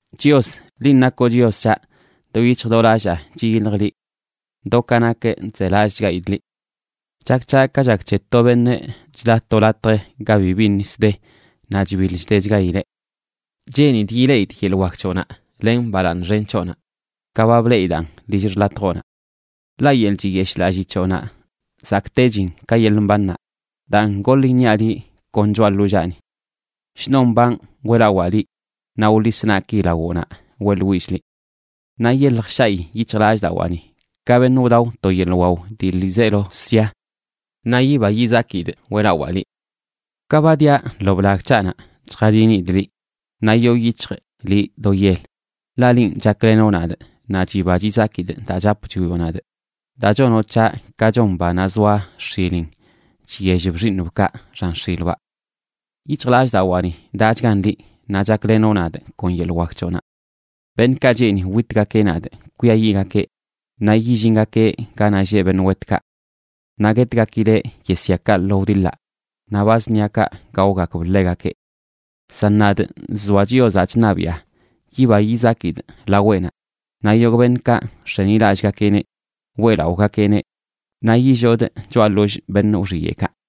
Chios, linꞌ nakoꞌ Chios c̱haꞌ. Do yic̱hj do lallaa chiyiljꞌ liꞌ. Do ka nakꞌ chzelallꞌchgaidꞌ liꞌ. Chak c̱haꞌ ka chak c̱he to beṉꞌ chda to latj ga bibi nis de naꞌ chbiḻ chdechgaileꞌ. Cheenidꞌ yileꞌidꞌ yeḻꞌ wak c̱hoꞌnaꞌ len balaaṉ xen c̱hoꞌnaꞌ, ka ba bleꞌidaꞌn lill xḻatjoꞌnaꞌ. Ḻaꞌ yeḻꞌ chiyeshꞌlallii c̱hoꞌnaꞌ zakꞌtechin ka yeḻꞌ mbannaꞌ, daan goḻ iṉiaꞌ liꞌ kon choꞌa ḻollaani. Shnon mbanꞌ weꞌlawaa liꞌ, naꞌ wḻis naꞌki lawoꞌnaꞌ weꞌḻwillꞌ liꞌ. Naꞌ yelj shaꞌi yic̱hjlallꞌdawaani, ka beṉꞌ wdao to yeḻꞌ wao dii ḻiizeelo sia. Naꞌ yiba yizakidꞌ weꞌlawaa liꞌ. Ka ba dia lo blag c̱haꞌnaꞌ chjadinidꞌ liꞌ, naꞌ yoo yic̱hjꞌ liꞌ do yel. Ḻaꞌ linꞌ chaklenoꞌ nadꞌ, naꞌ chiba chizakidꞌ daa chap chwioꞌ nadꞌ, daa chonoꞌ c̱haꞌ ka chon banaꞌ zoa x̱ilin chyellb xiiṉbkaꞌ xan x̱ilbaꞌ. Yic̱hjlallꞌdawaani daꞌchgan liꞌ, naꞌ chaklenoꞌ nadꞌ kon yeḻꞌ wak c̱hoꞌnaꞌ. Beṉꞌkaꞌ cheeni witgakeꞌ nadꞌ kwiayiꞌgakeꞌ naꞌ yillingakeꞌ ganaꞌ lleꞌ beṉꞌ wetkaꞌ. Naꞌ guetgakileꞌ yesyakaꞌ lo wdiḻaꞌ, naꞌ ba zṉiakaꞌ gaogakb ḻegakeꞌ. San nadꞌ, nzoa Chiozaꞌ chṉabiꞌa, yiba yizakidꞌ laweꞌnaꞌ, naꞌ yogꞌ beṉꞌkaꞌ nx̱enilallꞌgakeꞌneꞌ, weꞌlaꞌogakeꞌneꞌ. Naꞌ yillodꞌ choꞌa ḻollꞌ beṉꞌ wxiyeꞌkaꞌ.